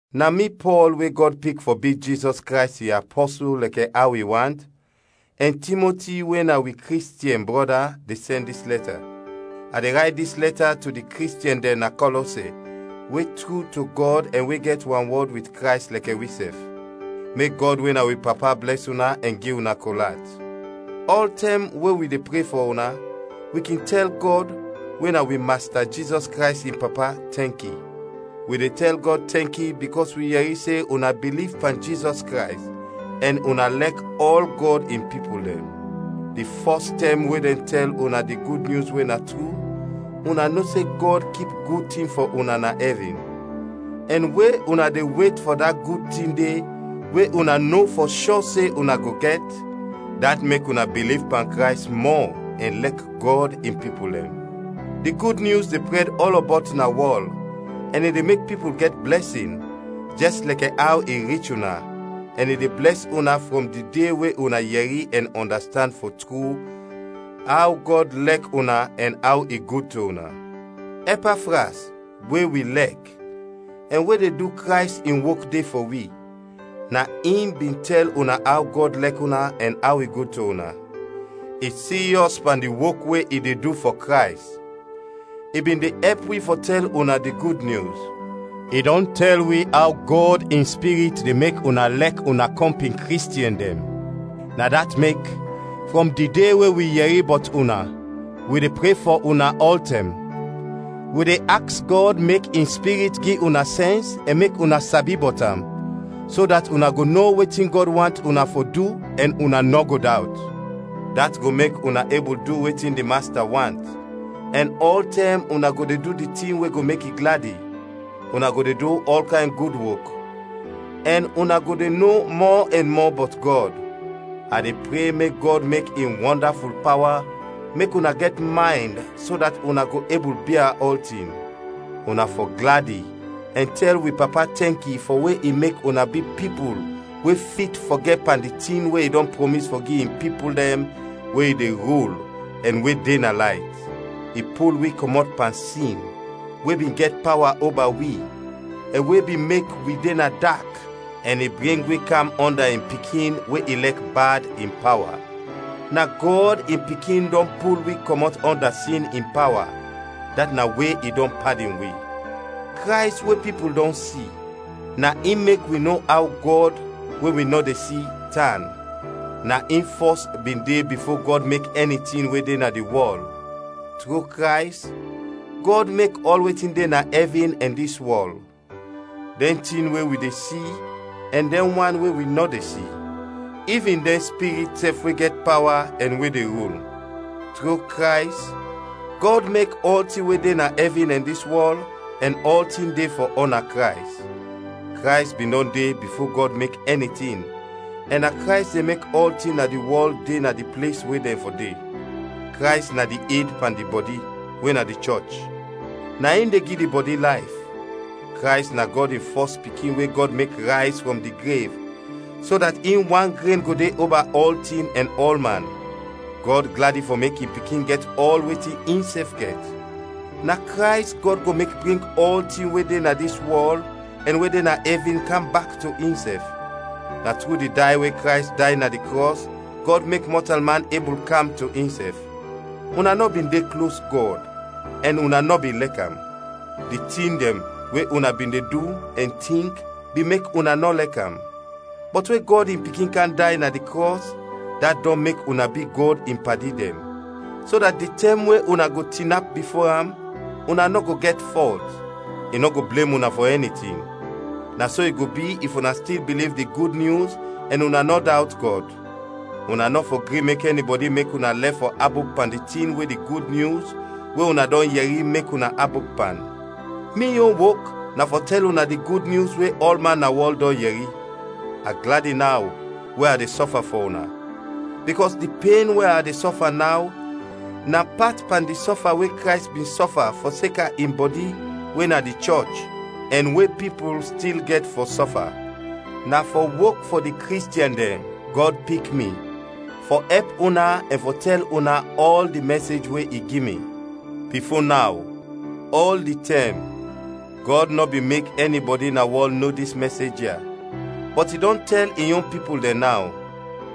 Na mi Pɔl we Gɔd pik fɔ bi Jizɔs Krays in apɔsul lɛkɛ aw i want, ɛn Timoti we na wi Kristiɛn brɔda, de sɛn dis lɛta. A de rayt dis lɛta to di Kristiɛn dɛn na Kɔlɔse, we tru to Gɔd ɛn we gɛt wanwɔd wit Krays lɛkɛ wisɛf. Mek Gɔd we na wi Papa blɛs una ɛn gi una kol at. Ɔltɛm we wi de pre fɔ una, wi kin tɛl Gɔd, we na wi Masta Jizɔs Krays in Papa, tɛnki. Wi de tɛl Gɔd tɛnki bikɔs wi yɛri se una biliv pan Jizɔs Krays ɛn una lɛk ɔl Gɔd in pipul dɛn. Di fɔs tɛm we dɛn tɛl una di Gud Nyus we na tru, una no se Gɔd kip gud tin fɔ una na ɛvin; ɛn we una de wet fɔ da gud tin de we una no fɔ shɔ se una go gɛt, dat mek una biliv pan Krays mɔ ɛn lɛk Gɔd in pipul dɛn. Di Gud Nyus de prɛd ɔlɔbɔt na wɔl ɛn i de mek pipul gɛt blɛsin, jɛs lɛkɛ aw i rich una ɛn i de blɛs una frɔm di de we una yɛri ɛn ɔndastand fɔ tru aw Gɔd lɛk una ɛn aw i gud to una. Ɛpafras, we wi lɛk, ɛn we de du Krays in wok de fɔ wi, na in bin tɛl una aw Gɔd lɛk una ɛn aw i gud to una. I siryɔs pan di wok we i de du fɔ Krays. I bin de ɛp wi fɔ tɛl una di Gud Nyus. I dɔn tɛl wi aw Gɔd in Spirit de mek una lɛk una kɔmpin Kristiɛn dɛn. Na dat mek frɔm di de we wi yɛri bɔt una, wi de pre fɔ una ɔltɛm. Wi de aks Gɔd mek in Spirit gi una sɛns ɛn mek una sabi bɔt am, so dat una go no wetin Gɔd want una fɔ du, ɛn una nɔ go dawt. Dat go mek una ebul du wetin di Masta want, ɛn ɔltɛm una go de du di tin we go mek i gladi; una go de du ɔl kayn gud wok, ɛn una go de no mɔ ɛn mɔ bɔt Gɔd. A de pre mek Gɔd mek in wɔndaful pawa mek una gɛt maynd so dat una go ebul bia ɔltin. Una fɔ gladi ɛn tɛl wi Papa tɛnki fɔ we i mek una bi pipul we fit fɔ gɛt pan di tin we i dɔn prɔmis fɔ gi in pipul dɛn we i de rul ɛn we de na layt. I pul wi kɔmɔt pan sin we bin gɛt pawa oba wi ɛn we bin mek wi de na dak ɛn i bring wi kam ɔnda in Pikin we i lɛk bad, in pawa. Na Gɔd in Pikin dɔn pul wi kɔmɔt ɔnda sin in pawa, dat na we i dɔn padin wi. Krays we pipul dɔn si, na in mek wi no aw Gɔd, we wi nɔ de si, tan. Na in fɔs bin de bifo Gɔd mek ɛni tin we de na di wɔl. Tru Krays, Gɔd mek ɔl wetin de na ɛvin ɛn dis wɔl, dɛn tin we wi de si ɛn dɛn wan we wi nɔ de si; ivin dɛn spirit sɛf we gɛt pawa ɛn we de rul. Tru Krays, Gɔd mek ɔltin we de na ɛvin ɛn dis wɔl ɛn ɔltin de fɔ ɔna Krays. Krays bin dɔn de bifo Gɔd mek ɛni tin ɛn na Krays de mek ɔltin na di wɔl de na di ples we dɛn fɔ de. Krays na di ed pan di bɔdi, we na di chɔch; na in de gi di bɔdi layf. Krays na Gɔd in fɔs Pikin we Gɔd mek rayz frɔm di grev, so dat in wan gren go de oba ɔltin ɛn ɔlman. Gɔd gladi fɔ mek in Pikin gɛt ɔl wetin insɛf gɛt. Na Krays Gɔd go mek bring ɔltin we de na dis wɔl ɛn we de na ɛvin kam bak to insɛf. Na tru di day we Krays day na di krɔs, Gɔd mek mɔtalman ebul kam to insɛf. Una nɔ bin de klos Gɔd ɛn una nɔ bin lɛk am; di tin dɛn we una bin de du ɛn tink bin mek una nɔ lɛk am. Bɔt we Gɔd in Pikin kam day na di krɔs, dat dɔn mek una bi Gɔd in padi dɛn, so dat di tɛm we una go tinap bifo am una nɔ go gɛt fɔlt, i nɔ go blem una fɔ ɛni tin. Na so i go bi if una stil biliv di Gud Nyus ɛn una nɔ dawt Gɔd. Una nɔ fɔ gri mek ɛnibɔdi mek una lɛf fɔ abop pan di tin we di Gud Nyus we una dɔn yɛri mek una abop pan. Mi yon wok na fɔ tɛl una di Gud Nyus we ɔlman na wɔl dɔn yɛri. A gladi naw we a de sɔfa fɔ una, bikɔs di pen we a de sɔfa naw na pat pan di sɔfa we Krays bin sɔfa fɔseka in bɔdi we na di chɔch, ɛn we pipul stil gɛt fɔ sɔfa. Na fɔ wok fɔ di Kristiɛn dɛn Gɔd pik mi fɔ ɛp una ɛn fɔ tɛl una ɔl di mɛsej we i gi mi. Bifo naw, ɔl di tɛm, Gɔd nɔ bin mek ɛnibɔdi na wɔl no dis mɛsej ya, bɔt i dɔn tɛl in yon pipul dɛn naw.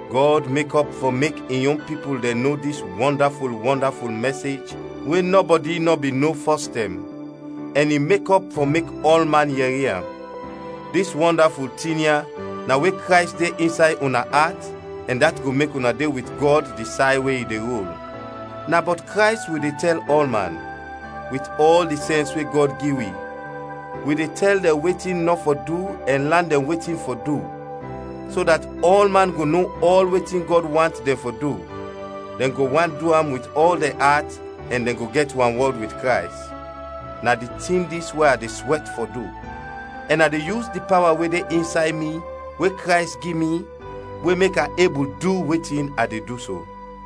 Gɔd mekɔp fɔ mek in yon pipul dɛn no dis wɔndaful, wɔndaful mɛsej we nɔbɔdi nɔ bin no fɔs tɛm, ɛn i mekɔp fɔ mek ɔlman yɛri am. Dis wɔndaful tin ya na we Krays de insay una at ɛn dat go mek una de wit Gɔd di say we i de rul. Na bɔt Krays wi de tɛl ɔlman. Wit ɔl di sɛns we Gɔd gi wi, wi de tɛl dɛn wetin nɔ fɔ du ɛn lan dɛn wetin fɔ du, so dat ɔlman go no ɔl wetin Gɔd want dɛn fɔ du, dɛn go want du am wit ɔl dɛn at, ɛn dɛn go gɛt wanwɔd wit Krays. Na di tin dis we a de swɛt fɔ du, ɛn a de yus di pawa we de insay mi, we Krays gi mi, we mek a ebul du wetin a de du so.